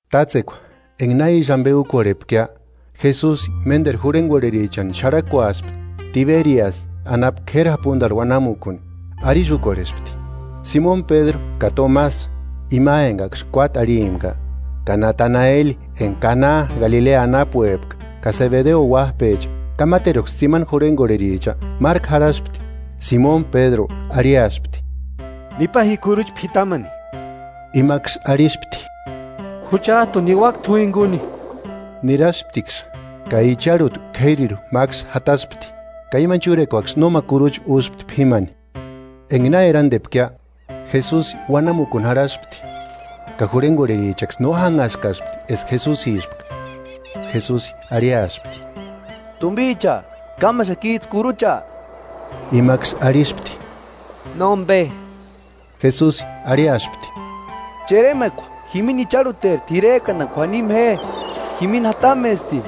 Tátsekua enga na ísï ambe úkorhepkia, Jesusi ménderu jurhengorherichani xarhakuaspti Tiberiasï anapu k'éri japundarhu uanamukuni. Arisï úkorhespti: Simoni Pédru ka Tomasi ima engaksï kuáti arhimpka, ka Nataneli enga Kana Galilea anapuepka ka Sebedeo uájpecha ka máteruksï tsimani jurhengorherichaksï márku jarhaspti. Simoni Pédru arhiaspti: –Nipa ji kurucha p'itamani. Imaksï arhispti: –Juchajtuni niuaka t'u jinguni. Nirasptiksï ka icharhuta k'érirhu máksï jataspti, ka imani chúrekuaksï nóma kurucha úspti p'ímani. Enga na erandepkia, Jesusi uanamukuni jarhaspti; ka jurhengorherichaksï no jánhaskaspti eska Jesusispka. Jesusi arhiaspti: –Tumbicha, ¿Kámaxakijtsï kurucha? Imaksï arhispti: –Nómbe. Jesusi arhiaspti: –Cheremakua jimini icharhuteri t'irerkandani k'uanima je, jimini jatamesti.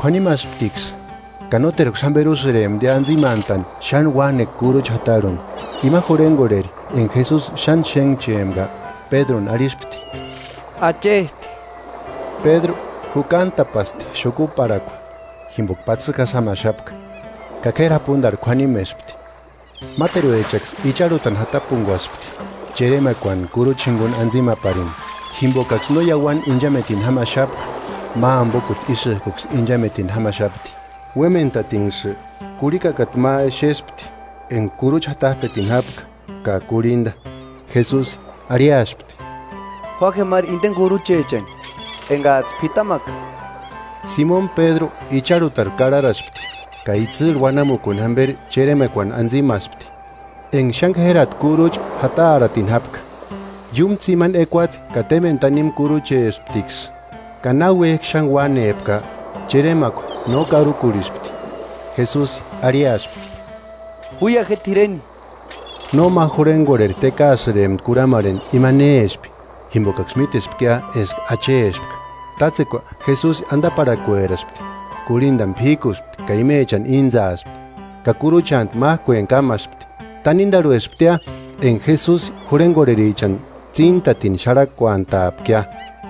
Kuanimasptiksï ka nóterksï jámberi úsïremptia antsimantani xáni uanekua kurucha jatarhuni. Ima jurhengorheri enga Jesusi xáni xénhchempka Pédruni arhispti: –¡Achesti! Pédru Jukantapaspti xukuparhakua, jimboka patsikjasï jámaxapka, ka k'éri japundarhu k'uanimespti. Máteruechaksï icharhutani jatapunguaspti cheremakuani kurucha jinguni antsimaparini, jimbokaksï no iauani inchametini jámaxapka, ma ambokuta ísïjkuksï inchametini jámaxapti. Uémentatinksï, kurhikakata ma exespti enga kurucha jatajpetini jápka ka kurhinda. Jesusi arhiaspti: –Jua je máru indeni kuruchechani engajtsï p'itamaka. Simoni Pédru icharhutarhu karharaspti ka itsïrhu uanamukuni jamberi cheremakuani antsimaspti enga xáni k'érati kuruchecha jukarhuatini jápka, ka iúmu tsimani ekuatse ka témbeni tanimu kuruchesptiksï. Ka náuejki xáni uánepka, cheremakua no karukurhispti. Jesusi arhiaspti: –Juia je t'ireni. Nóma jurhengorheri tékaasïrempti kurhamarheni ima néspki, jimbokaksï mítespkia eska Achespka. Tátsekua Jesusi andaparhakueraspti, kurhindani p'íkuspti ka imechani íntsaaspti; ka kuruchantu májkueni kámaspti. Tanindarhuesptia enga Jesusi jurhengorherichani tsíntatini xarhakuantapkia.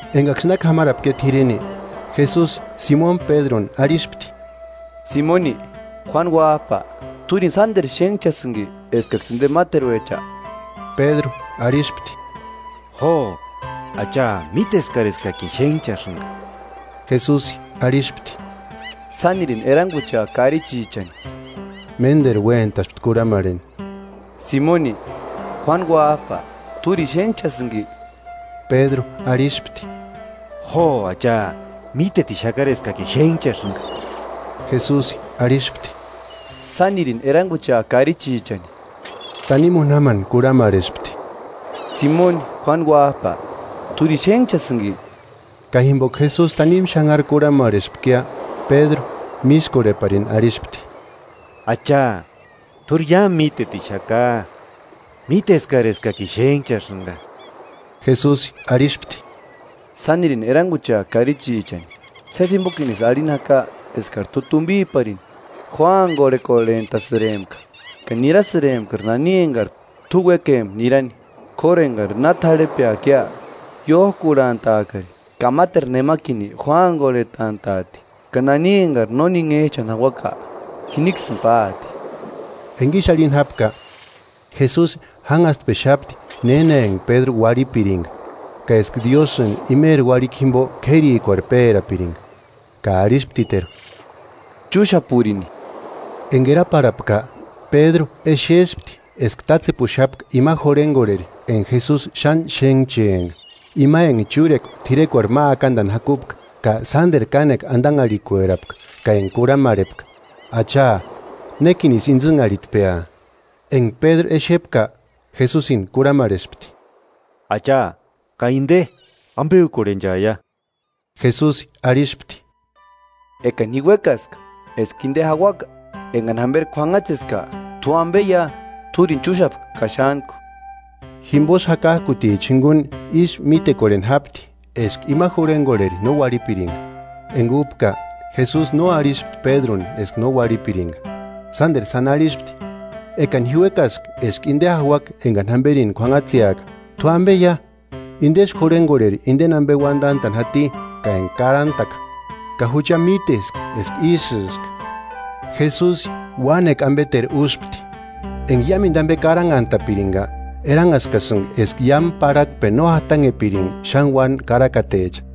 Engaksï na k'amarapkia t'ireni, Jesusi Simoni Pédruni arhispti: –Simoni, Juánu Uájpa, ¿T'úrini sánderu xénhchasïnki eskaksï inde máteruecha? Pédru arhispti: –Jo, Acha, míteskari eskakini xénhchasïnga. Jesusi arhispti: –Sánirini eranguchea karichichani. Ménderu uéntaspti kurhamarheni: –Simoni, Juánu uájpa, ¿T'úrini xénhchasïnki? Pédru arhispti: –Jo, Acha, mítetixakari eskakini xénhchasïnga. Jesusi arhispti: –Sánirini eranguchea karichichani. Tánimu úni jámani kurhamarhespti: –Simoni, Juánu uájpa, ¿T'úrini xénhchasïnki? Ka jimboka Jesusi tanimu xanhari kurhamarhespkia Pédru, mískorheparini arhispti: –Acha, t'úri iámu mítetixaka; míteskari eskakini xénhchasïnga, Jesusi arhispti: –Sánirini eranguchea karichichani. Sési jimbokinisï arhini jaka eskari t'u tumbiparini jóangorhekorhentasïrempka, ka nirasïrempkari nani engari t'u uékempka nirani; k'óru engari na t'arhepeakia, iójkurhantaakari ka máteru nemakini jóangorhetantantaati ka nani engari no ninhejchani jauaka jiniksïni páati. Enga ísï arhini jápka, Jesusi jánhastpexapti néna enga Pédru uarhipiringa ka eska Diósïni imeri uarhikua jimbo k'érikuarhu pérapiringa. Ka arhisptiteru: –¡Chúxapurini! Enga eraparhapka, Pédru exespti eska tátsepuxapka ima jurhengorheri enga Jesusi xáni xénhchempka, ima enga chúrekua t'irekuarhu ma akandani jakupka ka sánderu kánekua andanharhikuerapka ka enga kurhamarhepka: “Acha, ¿Nékinisï intsïnharhitpea?” Enga Pédru exepka, Jesusini kurhamarhespti: –Acha, ka inde ¿Ambe úkorhenchaia? Jesusi arhispti. –Ekani ji uékaska eska inde jauaka engani jamberi k'uanhatseska, ¿T'u ambeia? T'úrini chúxapa ka xántku. Jimbosï jakajkuticha jinguni ísï mítekorheni jápti eska ima jurhengorheri no uarhipiringa. Enga úpka Jesusi no arhispti Pédruni eska no uarhipiringa. Sánderu sáni arhispti: “Ekani ji uékaska eska inde jauaka engani jamberini k'uanhatseska, ¿T'u ambeia?” Indesï jurhengorheri indeni ambe uandantani jati ka enga karantaka, ka jucha míteska eska ísïska. Jesusi uánekua ambeteru úspti. Enga iámendu ambe karanhantapiringa, eranhaskasïnga eska iámu parhakpeni no jatanhepiringa xáni uáni karakatecha.